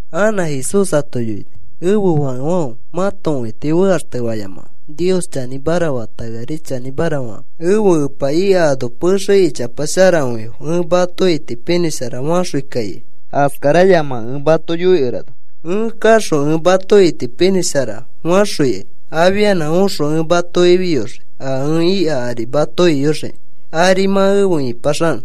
Anã Jesús ato yoini: “Ẽfe fakefãfe, mãto õiti fekaxtefayamakãfe. Nios chanĩmara fata, eari chanĩmara fakãfe. Ẽfe Epa ika ano pexe ichapa sharakõifo. Ẽ mato itipinĩsharafaxõi kaikai. Askarayamakẽ ẽ mato yoikerana. Ẽ kaxõ ẽ mato itipinĩshara faxõikai. Afianã oxõ ẽ mato ifiyoxii, a ẽ ika ari mato iyoxiki ari mã efe ĩpaxanõ.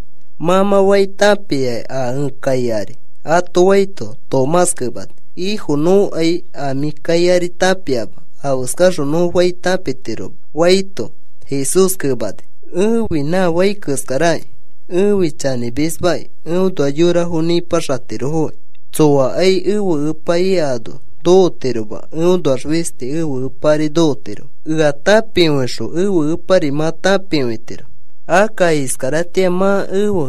Mã mã fai tãpiaki a ẽ kai ari,” ato faito, Tomás kemani: “Ifo, nõkai a mĩ kai ari tãpiama, afeskaxõ nõ fai tãpitiroma,” faito, Jesús kemani: “Ẽfi nã fai keskaraki. Ẽfi chanĩmismaki. Eõnoax yorafo nĩpaxatirofoki. Tsoakai ẽfe Epa ika ano nokotiroma. Eõnoax fisti ẽfe Epa ari nokotirofo. “Ea tãpikõixõ ẽfe Epari mã tãpikõitiro. Akka iskaratĩa mã ẽfe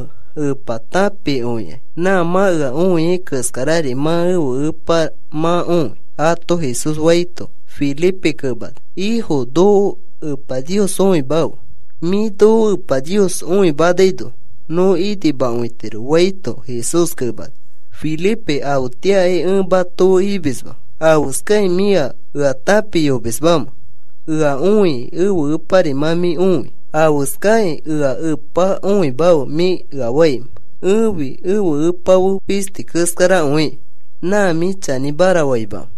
Epa tãpikõikai. Nã mã ea õiai keskarari mã ẽfe Epa mã õi,” ato Jesús faito, Felipe kemani: “Ifo, noko Epa Nios õimafe. Mĩ noko Epa Nios õimanaino nõ inimakõitiro,” faito, Jesús kemani: “Felipe, afetĩakai ẽ mato fe imisma. ¿Afeskakĩ mĩa ea tãpiyomismamẽ? Ea õikĩ ẽfe Epari mã mĩ õi. ¿Afeskakĩ: ‘Ea Epa õimafe,’ mĩ ea faimẽ? Ẽfi ẽfe Epa fe fisti keskarakõiki. ¿Nã mĩ chanĩmara faimamẽ?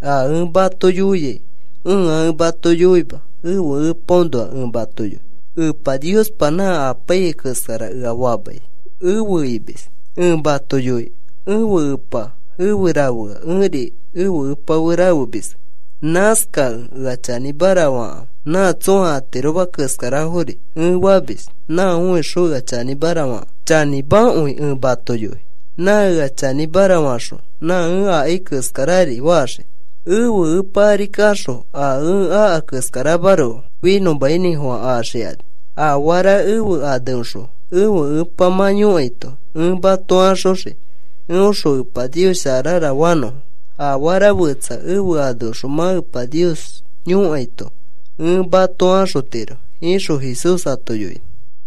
A ẽ mato yoiai ẽa ẽ mato yoima ẽfe Epaõnoa ẽ mato yoi. Epa Niospa nã apaiyai keskara ea famai efe imis. Ẽ mato yoi ẽfe Epa efe rafea ẽri ẽfe Epa fe rafemiski. Nãskakẽ ea chanĩmara fakãfe. Nã tsõa atiroma keskarafori ẽ famis nã õixõ ea chanĩmara fakãfe. “Chanĩmakõi ẽ mato yoi. Nã ea chanĩmara faxõ nã ẽ akai keskarari faxii. Ẽfe Epa ari kaxõ a ẽ aka keskaramaroko finõmainĩfofã axikani. Afara ẽfe aneõxõ ẽfe Epa mã yõkaito ẽ mato axoxii, eõxõ Epa Nios sharara fanõfo. Afara fetsa ẽfe aneõxõ mã Epa Nios yõkaito ẽ mato axotiro,” ixõ Jesús ato yoini.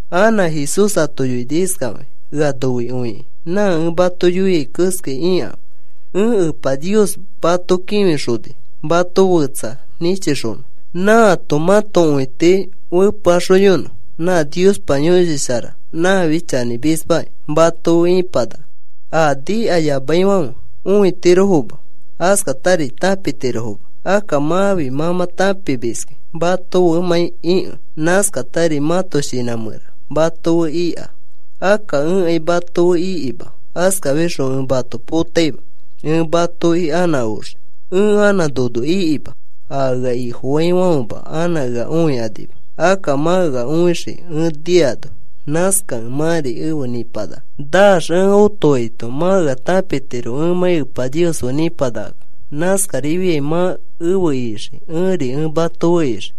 Anã Jesús ato yoini iskafakĩ: “Ea noikõikĩ nã ẽ mato yoiai keskai ikãfe. Ẽ Epa Nios mato kĩfixoni mato fetsa nĩchixonõ, nãato mãto õiti fepeaxoyonõ. Nã Niospa Yõshi Shara, nãfi chanĩmismaki. Mato fe ipanaka. A nikayamaifãfe õitirofoma. Askatari tãpitirofoma. Akka mãfi mã mã tãpimiski mato femãi ikẽ. Nãskatari mãto shinã mẽra mato fe ika. “Akka ẽkai mato fe ikima. Askafixõ ẽ mato potaima. Ẽ matoki anã oxii. Ẽ anã nono ikima. A ea Ifofaifãfema anã ea õikanima. Akka mã ea õixii, ẽ niano. Nãskakẽ mãri efe nĩpanaka. Naax ẽ otoaito mã ea tãpitiro ẽmãi Epa Nios fe nĩpanakakẽ. Nãskarifiai mã efe ixii. Ẽri ẽ mato fe ixii.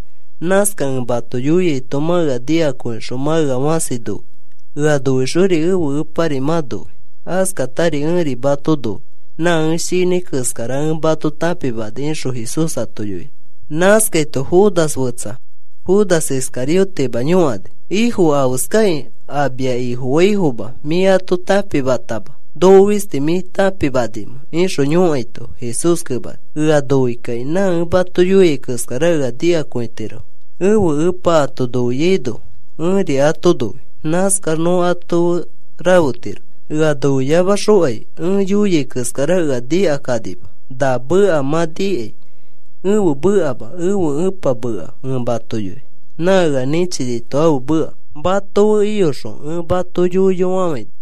Nãskakẽ ẽ mato yoiaito mã ea nikakõixõ mã ea fãsi noi. Ea noixori ẽfe Epari mã noi. Askatari ẽri ẽ mato noi. Nã ẽ shinãi keskara ẽ mato tãpimani,” ixõ Jesús ato yoini. Nãskaito Judas fetsa, Judas Iscariotema yõkani: “Ifo, ¿afeskakĩ a mia Ifofaifoma mĩ ato tãpimatama noko fisti mĩ tãpimanimẽ?” ixõ yõkaito, Jesús kemani: “Ea noikakĩ nã ẽ mato yoiai keskara ea nikakõitirofo. Ẽfe Epa ato noiaino ẽri ato noi. Nãskax nõ ato fe rafetiro. Ea noiyamakaxokai ẽ yoia keskara ea nikakanima. Na meka mã nikai ẽfe mekama, ẽfe Ẽpa meka ẽ mato yoi. Nã ea nĩchinito ãfe meka. “Mato fe iyoxõ ẽ mato yoiyofafãina.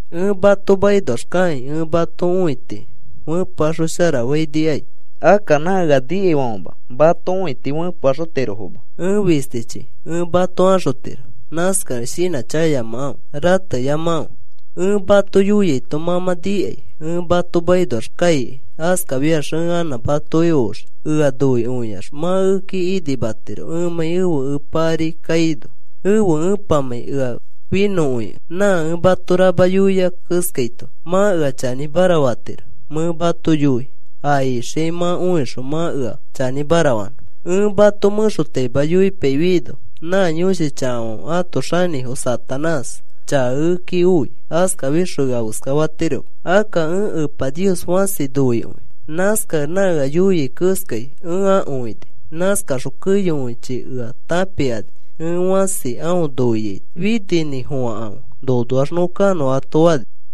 “Ẽ mato makinoax kakĩ ẽ mato õiti fepeaxosharafãinikai. Akka nã ea nikaifãfema mato õiti fepeaxotirofoma, ẽ fistichi ẽ mato axotiro. Nãskakẽ shinãchakayamakãfe. Rateyamakãfe. Ẽ mato yoiaito mã mã nikai ẽ mato makinoax kaikai. Askafiax ẽ anã matoki oxii. Ea noikõiax mã ekeki inimatiro ẽmãi ẽfe Epa ari kaino, ẽfe Epamãi ea finõkõikẽ. Nã ẽ mato rama yoiai keskaito mã ea chanĩmara fatiro. Mẽ mato yoi a ixiai mã õixõ mã ea chanĩmara fanõ. “Ẽ mato mẽxotaima yoipaifiaino nã yõshi chakafãfe ãto xanĩfo Satanás chaka ekeki oi. Askafixõ ea afeska fatiroma. Akka ẽ Epa Nios fãsi noikõi. Nãskakẽ nã ea yoiai keskai ẽ akõini. Nãskaxõ keyokõichi ea tãpikani ẽ fãsi aõ noiaito. Fininĩfofãkãfe. Nonoax nõ kanõ,” ato fani.